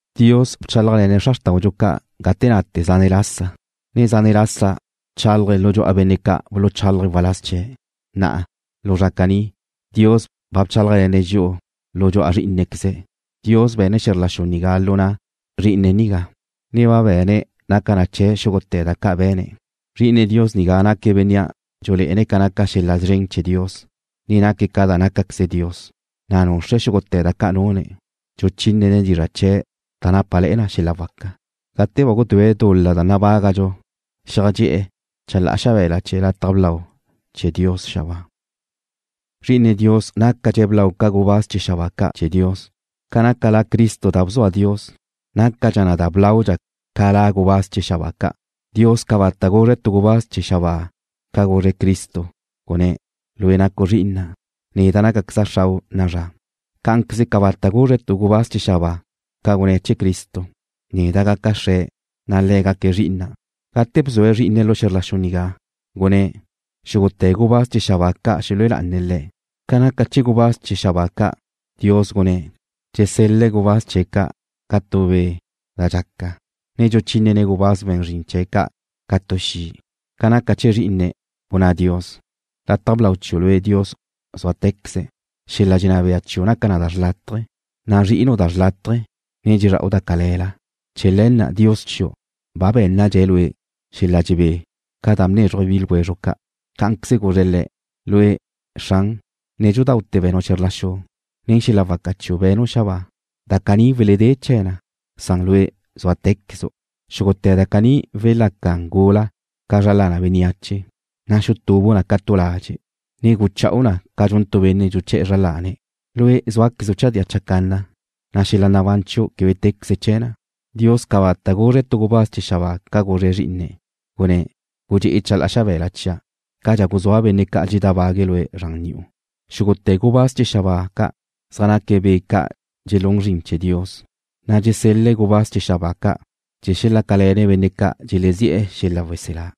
Dios bchálajle̱ne̱' xra xrtáudxu ca' gate nate zane' lasa, ne zane' ca bchálaje̱' lu dxu'a benne' ca' buluchálaje̱' waláz chee̱'. Na'a, lu zra caní, Dios ba bchálajle̱ne̱' dxi'u lu dxu'a Zrí'inequeze̱'. Dios be̱ne̱' xe̱zr la xu nigá lu na' Zrí'ine̱' nigá, ne ba be̱ne̱' naca chee̱' xúgute̱ da ca' be̱ne̱'. Zri'ine Dios nigá naque̱' Benne' dxulé'ene̱' ca naca xel-la' szren chee̱ Dios, ne naque̱' ca da nácaqueze Dios, na' nuxre̱' xúgute̱ da ca' nune̱', dxuchínene̱' dizra' chee̱' da nápale̱'e̱ na xel-la' waca. Gate ba gudúe̱' dul-la da nabágadxu xeajxedxé'e̱ chalá'a xabe̱la chee̱ lataj blau chee̱ Dios xabáa. Zri'ine Dios nácadxe̱' blau ca gubáz chee̱ xabáa ca' chee̱ Dios, ca naca La Cristo da bzua Dios, nácadxa na blau ca la gubáz chee̱ xabáa ca'. Dios cabata' guzre̱' tu gubáz chee̱ xabáa ca guzre̱' Cristo, gunné̱': Lue' nacu' Zri'ina'. Neda' nácaqueza' Xrau' na'a zra. Cá'anqueze cabata' guzre̱' tu gubáz chee̱ xabáa ca gunné̱' chee̱ Cristo: Neda' gaca' Xre̱', na' Le̱' gaque̱' Zri'ina'. Gate bzue̱' Zrí'ine̱' lu xe̱zr la xu nigá, gunné̱': Xúgute̱ gubáz chee̱ xabáa ca' xelue lá'ane̱' Le̱'. Ca naca chee̱ gubáz chee̱ xabáa ca', Dios gunné̱': Dsesel-le̱' gubáz chee̱' ca' ca tu be' da dxaca, ne dxuchínene̱' gubáz we̱n zrin chee̱' ca' ca tu xi'. Ca naca chee̱ Zrí'ine̱', gunná Dios: Lataj blau chiu' lue', Dios, zúate̱queze. Xel-la' dxenná bea chiu' naca na xlátaje̱. Nazri'inu' da xlátaje̱, ne dxezra'u da cale̱la. Chee̱ le̱ na' Dios chiu' ba bé̱nnadxe̱' Lue' xel-la dxebé ca da bnézruje̱' bi ljwezru' ca'. Cá'anqueze guzre̱' Le̱': Lue', Xran, nédxudaute̱ be̱nu' xe̱zr la xu. Nen xel-la' waca chiu' be̱nu' xabáa. Da caní weledé chee̱ na, san Lue' súate̱quezu'. Xúgute̱ da caní welaca gula ca zra lana bénneache. Na' xutubu' na ca tu ladxe', ne gucha'u na ca dxun tu benne' dxuché̱'e̱ zra lane̱'. Lue' zúaquezu' chadía chacanna, na' xel-la' nabán chiu' quebe téqueze chee̱ na. Dios cabata' guzre̱' tu gubáz chee̱ xabáa ca guzre̱' Zrí'ine̱', gunné̱': Gudxe'e chalá'a xabe̱la chia', cadxa guzúa' benne' ca' dxeledábague̱' Lue' zran ni'u. Xúgute̱ gubáz chee̱ xabáa ca' zaj naque̱' be' ca' dxelún zrin chee̱ Dios, na' dxesel-le̱' gubáz chee̱ xabáa ca' chee̱ xelácale̱ne̱' benne' ca' dxelezi'e̱ xel-la' weselá.